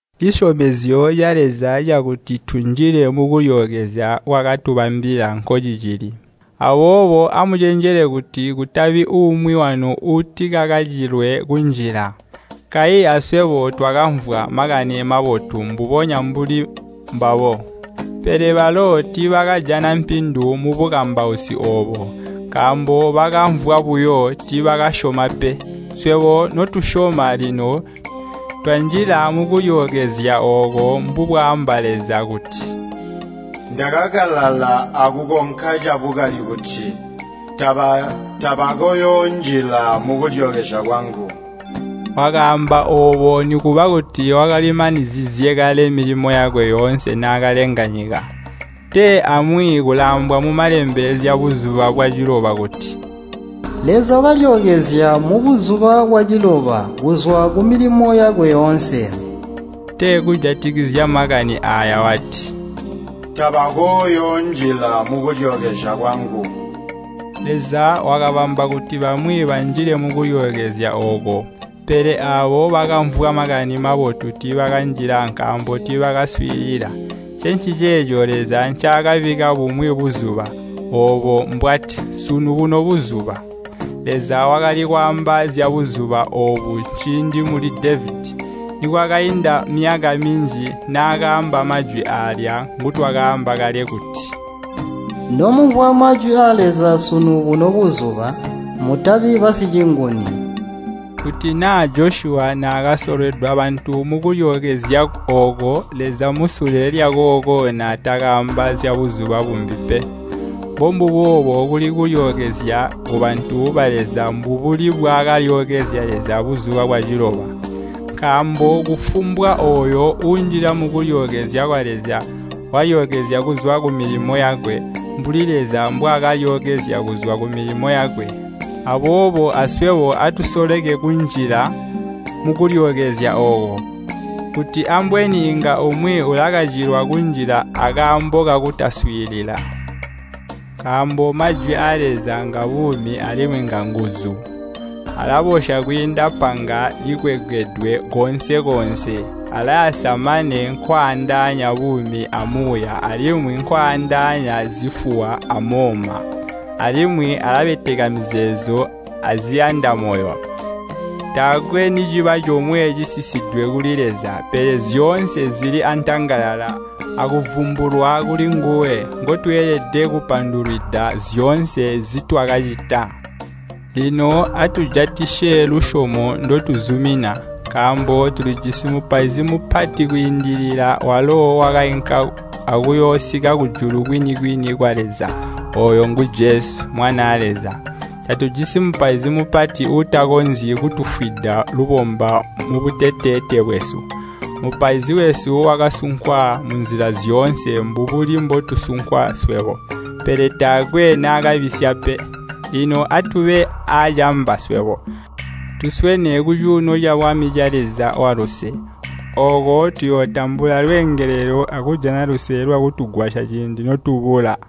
Cisyomezyo ca Leza cakuti tunjile mukulyookezya nkwaakatubambila nkocicili. Aboobo amucenjele kuti kutabi umwi wanu uutikakacilwe kunjila. Kayi aswebo twakamvwa Makani Mobotu mbubonya mbuli mbabo. Pele balo tiibakajana mpindu mubukambausi oobo, nkaambo bakamvwa buyo, tiibakasyoma pe. Swebo notusyoma lino twanjila mukulyookezya ooko mbubwaamba Leza kuti, “Ndakakalala akukonka cabukali kuti, ‘Tabakooyoonjila mukulyookezya kwangu.’” Wakaamba oobo nikuba kuti wakalimanizizye kale milimo yakwe yoonse naakalenga nyika. Tee amwi kulaambwa mu Malembe zyabuzuba bwaciloba kuti, “Leza wakalyookezya mubuzuba bwaciloba kuzwa kumilimo yakwe yoonse.” Tee kujatikizya makani aaya wati, “Tabakooyoonjila mukulyookezya kwangu.” Leza wakabamba kuti bamwi banjile mukulyookezya ooko. Pele aabo bakamvwa Makani Mabotu tiibakanjila nkaambo tiibakaswiilila. Ncenciceeco Leza ncaakabikka bumwi buzuba, oobo mbwati, “Sunu buno buzuba.” Leza wakali kwaamba zyabuzuba oobu ciindi muli Devedi, nikwakainda myaka minji, naakaamba majwi aalya ngutwaamba kale kuti, “Nomumvwa majwi aa Leza sunu buno buzuba, mutabi basicinguni.” Kuti naa Josyuwa naakasolweda bantu mukulyookezya ooko, Leza musule lyakooko naatakaamba zyabuzuba bumbi pe. Mbombubo kuli kulyookezya kubantu ba Leza mbubuli mbwaakalyookezya Leza buzuba bwaciloba. Nkaambo kufumbwa ooyo uunjila mukulyookezya kwa Leza walyookezya kuzwa kumilimo yakwe, mbuli Leza mbwaakalyookezya kuzwa kumilimo yakwe. Aboobo aswebo atusoleke kunjila mukulyookezya ooko, kuti ambweni inga umwi ulakacilwa kunjila akaambo kakutaswiilila. Nkaambo Majwi aa Leza ngabuumi alimwi nganguzu. Alabosya kwiinda panga likwengedwe koonse-koonse. Alayasa mane kwaandaanya buumi amuuya alimwi kwaandaanya zifuwa amooma. Alimwi alabeteka mizeezo aziyanda moyo. Taakwe niciba comwe cisisidwe kuli Leza, pele zyoonse zili antangalala akuvumbulwa kulinguwe, ngotweelede kupandulwida zyoonse nzitwakacita. Lino atujatisye lusyomo ndotuzumina. Nkaambo tulijisi Mupaizi Mupati kwiindilila, walo wakainka akuyoosika kujulu kwini-kwini kwa Leza. Ooyo ngu Jesu, Mwanaa Leza. Tatujisi Mupaizi Mupati uutakonzyi kutufwida lubomba mubuteteete bwesu. Mupaizi wesu wakasunkwa munzila zyoonse, mbubuli mbotusunkwa swebo. Pele taakwe naakabisya pe. Lino atube aacamba swebo, tuswene kucuuno cabwami ca Leza waluse. Ooko tuyootambula lweengelelo akujana luse lwakutugwasya ciindi notubula.